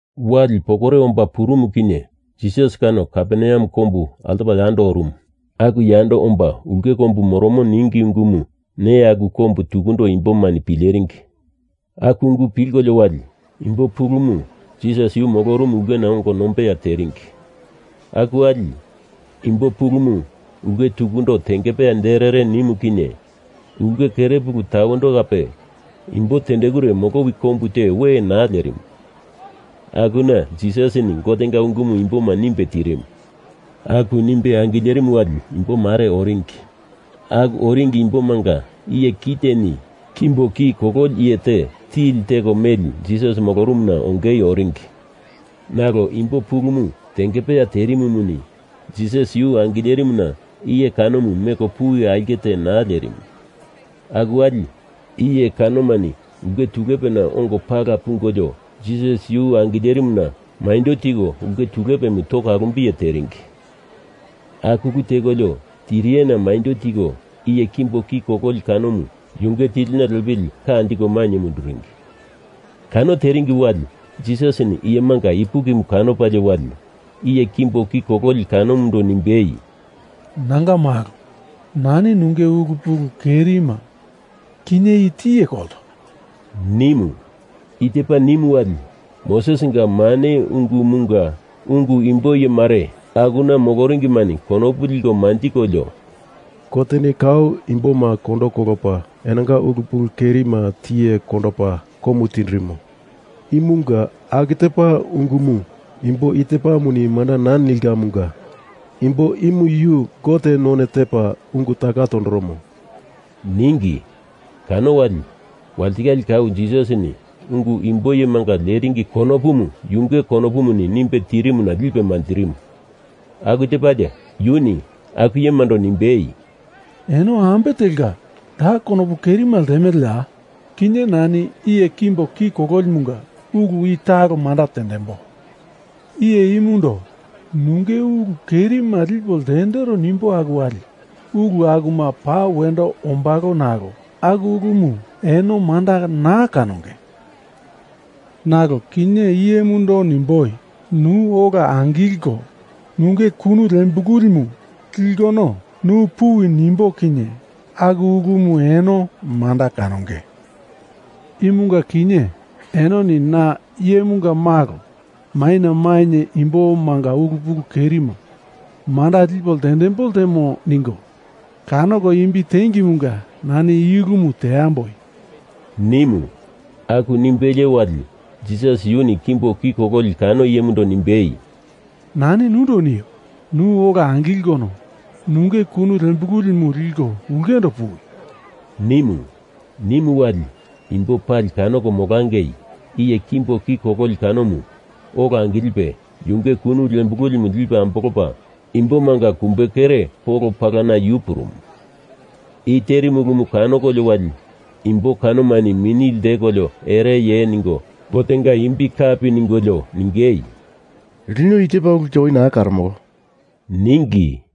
Wali pokore omba purumu kinye Jisas kano Kaperneam kombu altopa yando orumu. Aku yando omba ulke kombu moromo ningi ungumu neya aku kombu tukundo imbomani pileringi. Aku ungu pilkolio wali, imbo pulumu Jisas yu molorumu ulkena ongo nombeya teringi. Aku wali, imbo pulumu ulke tukundo tengepeya derere nimu kinye ulke kere puluna tawendo kape imbo tendekure molowi kombu te we naa lerimu. Akuna Jisasini Gotenga ungumu imboma nimbe tirimu. Aku nimbe angilerimu wali imbomare oringi. Aku oringi imbomanga iye kiteni kimbo ki kololi iye te tili teko meli Jisas molorumuna ongei oringi. Nalo imbo pulumu tengepeya terimumuni Jisas yu angilerimuna iye kanomu meko puwi aulke naa lerimu. Aku wali iye kanomani ulke tulepena ongo pala pungolio Jisas yu angilerimuna maindo tiko ulke tulepemu toko alumbiye teringi. Aku ulu tekolio tiriyena maindo tiko iye kimbo ki kololi kanomu yunge tilina lepili ka anjiko mainye munduringi. Kano teringi wali Jisasini iyemanga ipukimu kanopalie wali iye kimbo ki kololi kanomundo nimbei, “Nanga malo, nani nunge ulu pulu kerima kinye i tiye kolto,” nimu. I tepa nimu wali, Mosesinga mane ungumunga ungu imbo iyemare akuna moloringimani konopu liko manjikolio, “Goteni kau imboma kondo kolopa enonga ulu pulu kerima tiye kondopa komu tindirimo. Imunga aku tepa ungumu imbo i tepamuni manda naa nilkamunga imbo imu yu Gote none tepa ungu taka tondoromo,” ningi. Kano wali, walitikale kau Jisasini ungu imbo iyemanga leringi konopumu yunge konopumuni nimbe tirimuna lipe manjirimu. Aku tepalie yuni aku iyemando nimbei, “Eno ambe telka da konopu kerimu ltemeleya? Kinye nani iye kimbo ki kololimunga ulu i talo manda tendembo. Iye imundo nunge ulu kerima lipo ltendero nimbo aku wali ulu akumu pa wendo ombalo nalo aku ulumu eno manda naa kanonge. Nalo kinye iyemundo nimboi nu ola angilko nunge kunu lembilimu likono nu puwi nimbo kinye aku ulumu eno manda kanonge. Imunga kinye enoni na Iyemunga Malo maina mainye imbomanga ulu pulukerima manda lipo ltendembo ltemo ningo kanoko imbi tengemunga nani I ulumu teamboi,” nimu. Aku nimbelie wali Jisas yuni kimbo ki kololi kano iyemundo nimbei, “Nani nundo nio, nu ola angilkono nunge kunu lembilimu liko ulkendo puwi,” nimu. Nimu wali, imbo pali kanoko molangei iye kimbo ki kololi kanomu ola angilipe yunge kunu lembilimu lipe ambolopa imbomanga kumbekere polo palana yu purumu. I terimu ulumu kanokolio wali imbo kanomani mini ltekolio ereye ningo Gotenga imbi kape ningolio ningei, “Lino i tepa ulte oi naa karomolo,” ningi.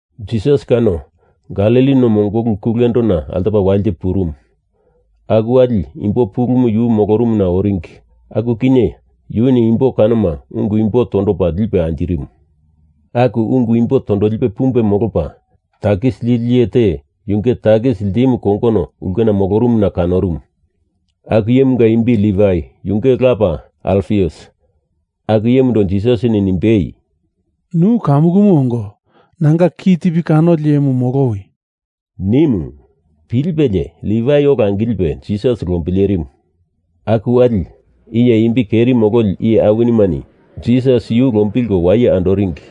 Jisas kano Galili no mongolu kulendona altopala walite purumu. Aku wali imbo pulumu yu molorumuna oringi aku kinye yuni imbo kanoma ungu imbo tondopa lipe anjirimu. Aku ungu imbo tondolipe pumbe molopa, takis lili iye te yunge takis ltimu kongono ulkena molorumuna kanorumu. Aku iyemunga imbi Livai yunge lapa Alfius. Aku iyemundo Jisasini nimbei, “Nu kamukumu ongo nanga kitipi kanoli iyemu molowi,” nimu. Pilipelie Livai ola angilipe Jisas lombilerimu. Aku wali iye imbi keri mololi iye awinimani Jisas yu lombilko waye andoringi.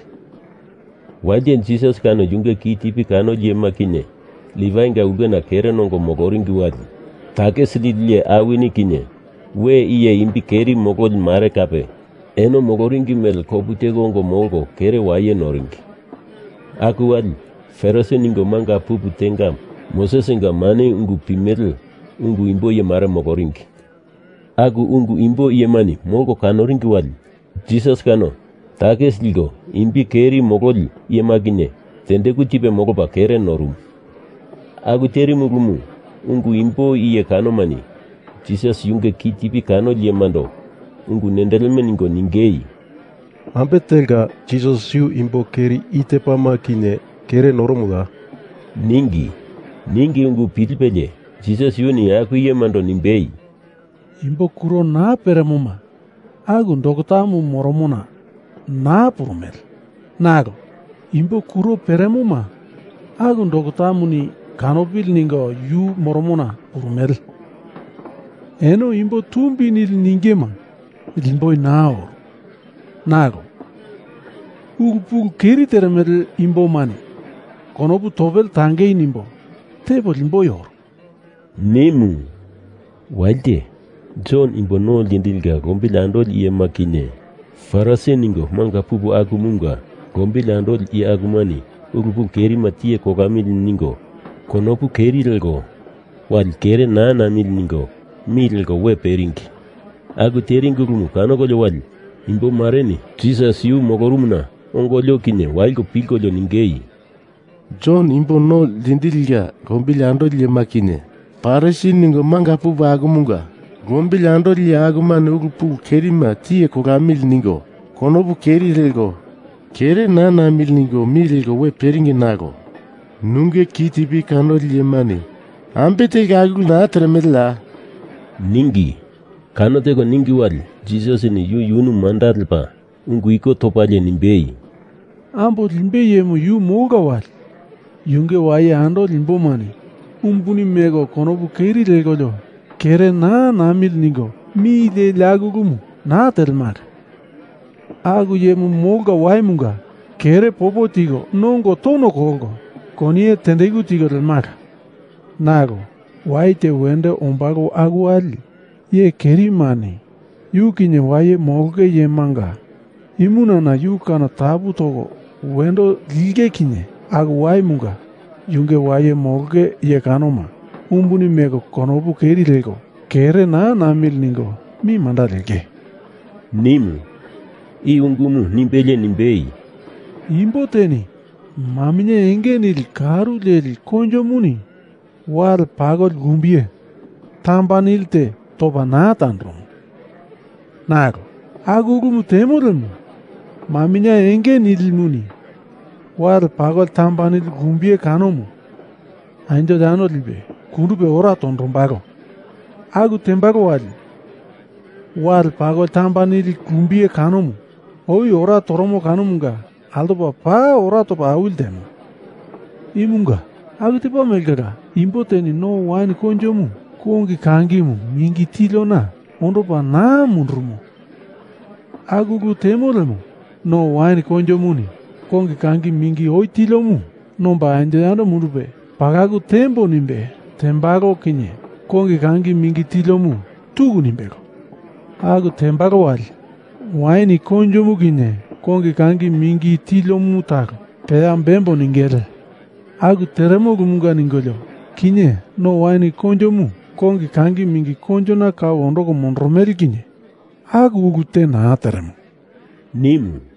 Walite Jisas kano yunge kitipi kanoli iyema kinye Livainga ulke kere nongo moloringi wali, takis lili iye awini kinye we iye imbi keri mololi mare kape eno moloringi mele kopu teko ongo molko kere waye noringi. Aku wali, Farisi ningo manga pupu tenga Mosesinga mane ungu pimele ungu imbo iyemare moloringi. Aku ungu imbo iyemani molko kanoringi wali Jisas kano takis liko imbi keri mololi iyema kinye tendeku tipe molopa kere norumu. Aku terimu ulumu ungu imbo iye kanomani Jisas yunge kitipi kanoli iyemando ungu nendeleme ningo ningei, “Ambe telka Jisas yu imbo keri i tepama kinye kere noromoya?” ningi. Ningi ungu pilipelie Jisas yuni aku iyemando nimbei, “Imbo kuro naa peremoma aku doktamu moromona naa purumele nalo imbo kuro peremoma aku doktamuni kanopili ningo yu moromona purumele. Eno imbo tumbi nili ningema limboi naa oru nalo ulu pulu keri teremele imbomani konopu topele tangei nimbo tepo limboi oru,” nimu. Walite Jon Imbo No Ltindilinga lombili andoli iyema kinye Farisi ningo manga pupu akumunga lombili andoli iye akumani ulu pulu kerima tiye kolamili ningo konopu keri leko wali kere naa namili ningo mi leko we peringi. Aku teringi ulumu kanokolio wali imbo mareni Jisas yu molorumuna ongolio kinye waliko pilkolio ningei, “Jon Imbo No Ltindilinga lombili andoli iyema kinye Farisi ningo manga pupu akumunga lombili andoli iye akumani ulu pulu kerima tiye kolamili ningo konopu keri leko kere naa namili ningo mi leko we peringi nalo nunge kitipi kanoli iyemani ambe telka aku ulu naa teremeleya?” ningi. Kano teko ningi wali Jisasini yu yunu manda lepa ungu iko topalie nimbei, “Ambo limbei iyemu yu molka wali yunge waye andoli imbomani umbuni meko konopu keri lekolio kere naa namili ningo mi leli aku ulumu naa telimala. Aku iyemu molka waimunga kere popo tiko nongo tono kolko koniye tendeku tiko lemala. Nalo, wai te wendo ombalo aku wali iye kerimani yu kinye waye molonge iyemanga imunana yu kano tapu toko wendo linge kinye aku waimunga yunge waye molonge iye kanoma umbuni meko konopu keri leko kere naa namili ningo mi manda lenge,” nimu. I ungumu nimbelie nimbei, “Imbo teni maminye enge nili karu leli koinjomuni wale pakoli lumbiye tamba nilite topa naa tandoromo. Nalo aku ulu temo lemo, maminye enge nilimuni wale pakoli tamba nili lumbiye kanomu anjo yando lipe kundupe ora tondombalo. Aku tembalo wali wale pakoli tamba nili lumbiye kanomu oi ora toromo kanomunga altopa paa ora topa awili ltemo. Imunga aku tepa mele kala, imbo teni no wain koinjomu kongi kangimu mingi tiliona ondopa naa mundurumo. Aku ulu temo lemo, no wain koinjomuni kongi kangi mingi oi tiliomu nomba anjo yando mundupe pakalu tembo nimbe tembalo kinye kongi kangi mingi tiliomu tuku nimbelo. Aku tembalo wali wain koinjomu kinye kongi kangi mingi tiliomu talo peya bembo ningele. Aku teremo ulumunga ningolio kinye no wain koinjomu kongi kangi mingi koinjona kau ondoko mondoromele kinye aku ulu te naa teremo,” nimu.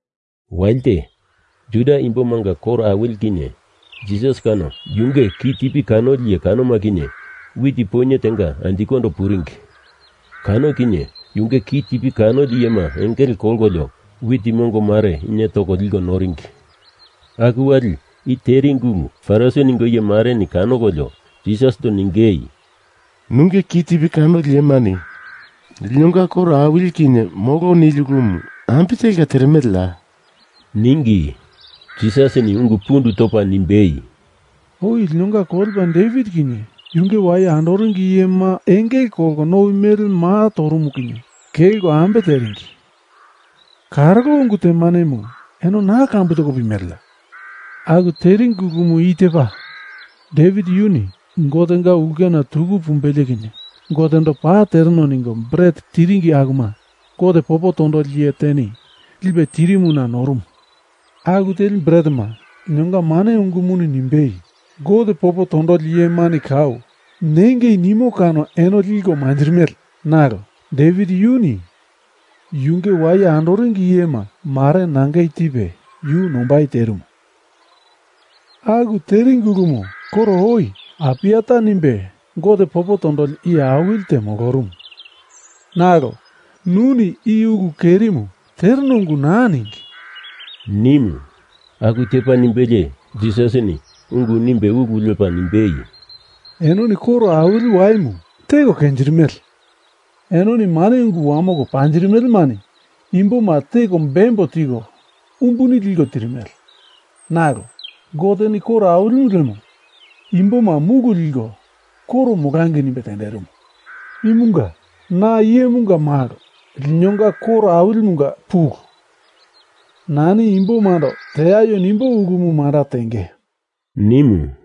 Walite Juda imbomanga koro awili kinye Jisas kano yunge kitipi kanoli iye kanoma kinye wit poinye tenga anjikondo puringi. Kano kinye yunge kitipi kanoli iyema engele kolkolio wit mongomare inie toko noliko puringi. Aku wali i teringi ulu Farisi ningo iye mareni kanokolio Jisasindo ningei, “Nunge kitipi kanoli iyemani linonga koro awili kinye molo nili ulumu ambe telka teremeleya?” ningi. Jisasini ungu pundu topa nimbei, “Oi linonga kolepa Devit kinye yunge waye andoringi iyema engele kolko nowi mele maa torumu kinye kelko ambe teringi karolo ungu temanemu eno naa kambu toko pimeleya? Aku teringi ulumu i tepa, Devit yuni Gotenga ulkena tuku pumbelie kinye Gotendo paa tereno ningo bret tiringi akuma Gote popo tondoli iye teni lipe tirimuna norumu. Aku teli bretema linonga mane ungumuni nimbei Gote popo tondoli iyemani kau nangei nimo kano eno liko manjirimele. Nalo Devit yuni yunge waye andoringi iyema mare nangei tipe yu nombai terimu. Aku teringi ulumu koro oi Apiata nimbe Gote popo tondoli iye awili te molorumu. Nalo, nuni i ulu kerimu tereno ungu naa ningi,” nimu. Aku tepa nimbelie Jisasini ungu nimbei ulu lepa nimbei, “Enoni koro awili waimu teko kenjirimele. Enoni mane ungu wamoko panjirimelemani imboma teko bembo tiko umbuni liko tirimele. Nalo Goteni koro awilimu lemo imboma mulu liko koro molangei nimbe tenderimu. Imunga na Iyemunga Malo linonga koro awilimunga pulu. Nani imbomando teaio nimbo ulumu manda tenge,” nimu.